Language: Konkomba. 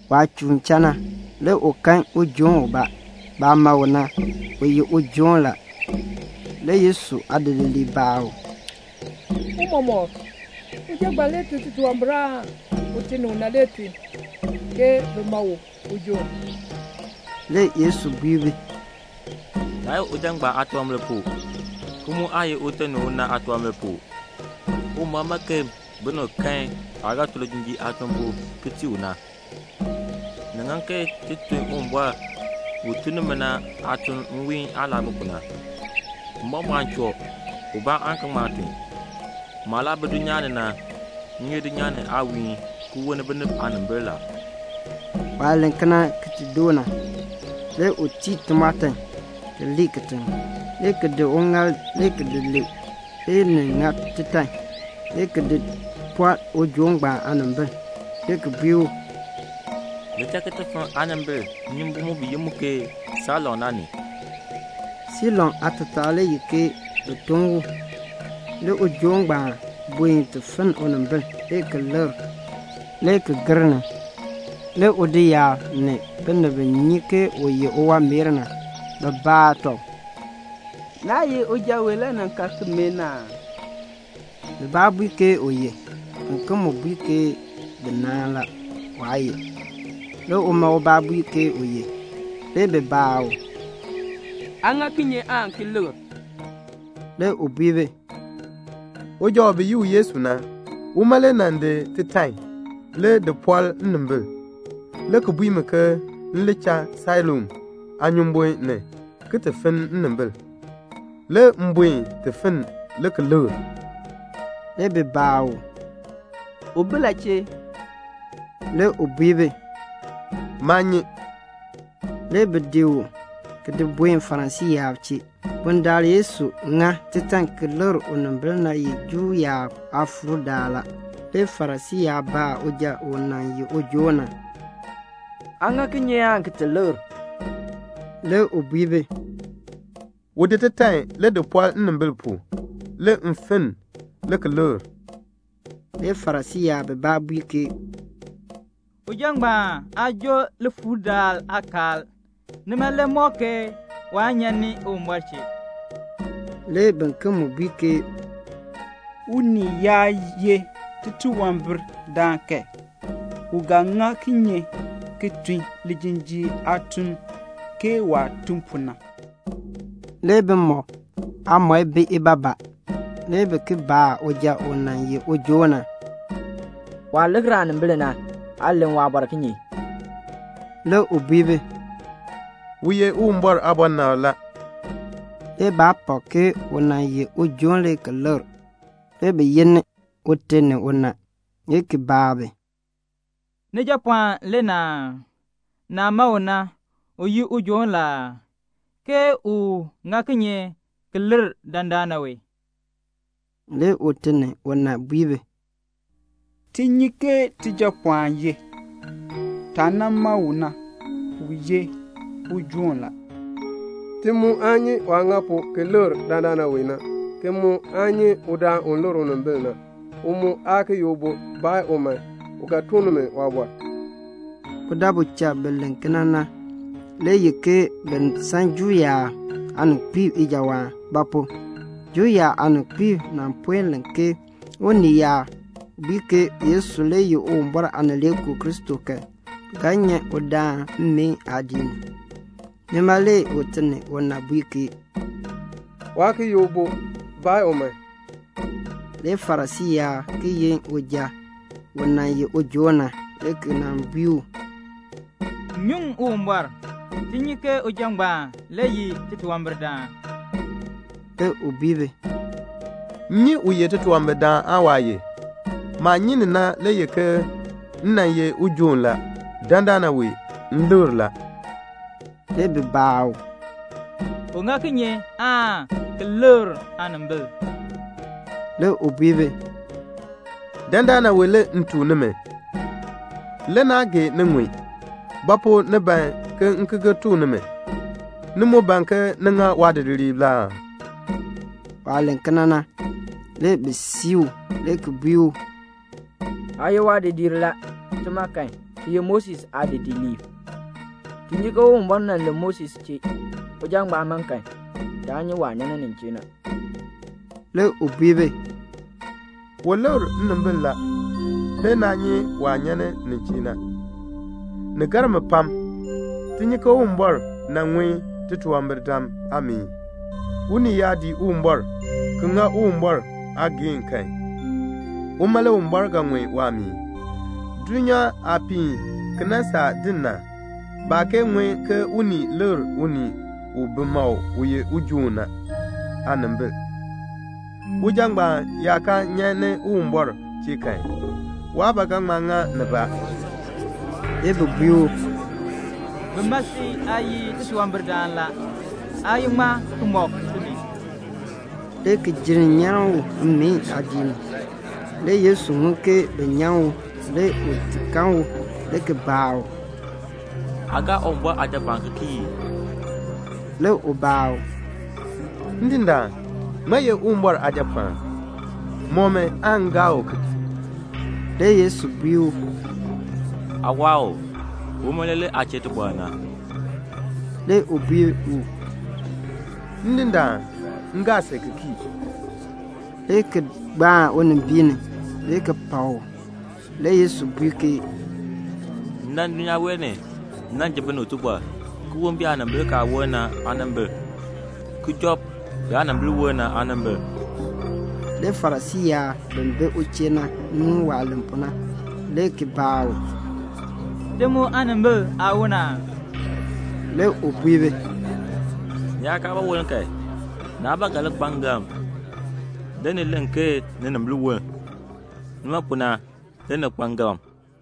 Waah chuun cha na, le u kan ujoon ubaa. Baah ma u na, u ye ujoon la. Le Yesu aadidiliib baa u, "Tiicha, uja ngbaan le tun titunwambir aan ute ni una le tun, ke bi ma u ujoon." Le Yesu bui bi, "Naa ye uja ngbaan aatunwambir pu, ki mu aa ye ute ni una aatunwambir pu. Uwumbɔr ban ke binib kan waah ga tun lijinjiir aatuln pu ki tii u na. Ni ŋan ke ti tun Uwumbɔr u tun ni mi na aatuln nwiihn aah laa bi pu na; mbɔmbɔɔn choo, ubaa aan ki ŋma tun. Maah laa bi dulnyaa ni na, m ye dulnyaa ni aawiihn ki wolni binib aanimbil la." Waah len kena ki ti doo na, le u tii timɔɔtan, ki lii kitiŋ, le ki di uŋaal le ki lee, le ni ŋa titan, le ki di pɔl ujoon ngbaan aanimbil, le ki bui u, "Li cha ki ti finn aanimbil nnyumbun mu bi yi mu ke Siloam na ni." Siloam aatataa le ye ke "Bi tun u." Le ujoon ngbaan buen ti finn unimbil, le ki likr, le ki gir ni. Le udoyaab, ni binib bi nyi ke u ye uwanmeer na, bi baa tɔb, "Naa ye uja wee le nan ka ki mee na aa?" Bibaa bui ke u ye. Biken mu bui ke bi naahn la, waa ye. Le uma ubaa bui ke u ye. Le bi baa u, "Aa ŋa kinye aan ki likr?" Le u bui bi, "Uja u bi yi u Yesu na, uma le nan ŋa titan, le ki di pɔl nnimbil, le ki bui mi ke m li cha Siloam aanyumbun ni ki ti finn nnimbil. Le m buen ti finn le ki likr." Le bi baa u, "U bi la chee?" Le u bui bi, "Maa nyi." Le bi di u ki di buen Farisii yaab chee. Bundaln Yesu ŋa titan ki likr unimbil na ye Juu yaab aakpakool daal la. Le Farisii yaab baa uja u nan ye ujoon na, "Aa ŋa kinye aan ki ti likr?" Le u bui bi, "U di titan le di pɔl nnimbil pu, le m finn, le ki likr." Le Farisii yaab bibaa bui ke, "Uja ngbaan aa joo likpakool daal aakaal, nima le mɔk ke waa nyan ni Uwumbɔr chee." Le biken mu bui ke, "Unii yaa ye titunwambirdaan kan, u ga ŋa kinye ki tun lijinjiir aatuln ke waah tun pu na?" Le bimɔk aamɔi bi ibaabaa. Le bi ki baa uja u nan ye ujoon na, "Waah likr aanimbil na, aa len waabɔr kinye?" Le u bui bi, "U ye Uwumbɔr aabɔnabr la." Le baa pak ke u nan ye ujoon le ki likr. Le bi yin ute ni una, le ki baa bi, "Nijapɔɔn le na aa? Naah ma u na, u ye ujoon la aa? ke u ŋa kinye ki likr dandana wee?" Le ute ni una bui bi, "Ti nyi ke tijapɔɔn ye. Taah nan ma u na, u ye ujoon la. Ti mu aa nyi waah ŋa pu ki likr dandana wee na, ki mu aa nyi udaan u likr unimbil na. U mu aa ki ye ubo. Baa u man. U ga tuk nimi waabɔr." Budabu cha bi len kena na le ye ke bi san Juu yaab aaninkpiib ijawaan; ba pu? Juu yaab aaninkpiib nan puen len ke unii yaa bui ke Yesu le ye Uwumbɔr Aanileekoo Kristo kan, bi ga nyan udaan mmeen aadiik ni. Nima le ute ni una bui ke, "Waa ki ye ubo. Baa u man." Le Farisii yaab ki yin uja u nan ye ujoon na, le ki nan bui u, "Nyuŋ Uwumbɔr. Ti nyi ke uja ngbaan le ye titunwambirdaan." Le u bui bi, "M nyi u ye titunwambirdaan aan waa ye. Maah nyi ni na le ye ke m nan ye ujoon la. Dandana wee m likr la." Le bi baa u, "U ŋa kinye ti likr aanimbil?" Le u bui bi, "Dandana wee le m tuk nimi. Le naa gee ni ŋun. Ba pu ni ban ke m ki gir tuk nimi? Ni mu ban ke ni ŋa waadidiliib la aa?" Waah len kena na, le bi sii u, le ki bui u, "Aa ye waadidiir la. Tima kan, ti ye Moses aadidiliib. Ti nyi ke Uwumbɔr nan len Moses chee. Uja ngbaan ma kan, taa nyi waah nyan nin chee na." Le u bui bi, "U likr nnimbil la. Le naa nyi waah nyan nin chee na. Ni gar mi pam. Ti nyi ke Uwumbɔr aan ŋun titunwambirdam aameen. Unii yaa dii Uwumbɔr ki ŋa Uwumbɔr aageehn kan, uma le Uwumbɔr ga ŋun waameen. Dulnyaa aah piin ki nan saa din na, baa kee ŋun ke unii likr unii u bi ma u ijoon ni na aanimbil. Uja ngbaan yaa kaa nyan ni Uwumbɔr chee kan, waa ba ga ŋma ŋa nibaa." Le bi bui u, "Bi ma si aa ye titunwambirdaan la. Aa ye ŋmaa ki mɔk timi?" le ki jenn nyan u mmeen aadiik ni. Le Yesu ŋun ke bi nyan u. Le u ti kan u, le ki baa u, "Aa gaa Uwumbɔr Aajapɔɔn ki kii ii?" Le u baa u, "Ndindaan, ŋmaa ye Uwumbɔr Aajapɔɔn? Mɔk mi aan m gaa u ki kii." Le Yesu bui u, "Aa waa u. Uma le len aa chee tibɔr na." Le u bui u, "Ndindaan, m gaa si ki kii," le ki gbaan unimbiin ni, le ki pak u. Le Yesu bui ke, "M dan dulnyaa wee ni, m nan ji binib tibɔr, ki woln biyaanimbil kaa woln na aanimbil, ki job biyaanimbil woln na aanimbil." Le Farisii yaab bi bi u chee na ŋun waah len pu na, le ki baa u, "Ti mu aanimbil aa woln aa?" Le u bui bi, "Ni yaa kaa ba woln kan, naa ba ga li kpa ngalm. Le ni len ke ninimbil woln. Nima pu na, le ni kpa ngalm."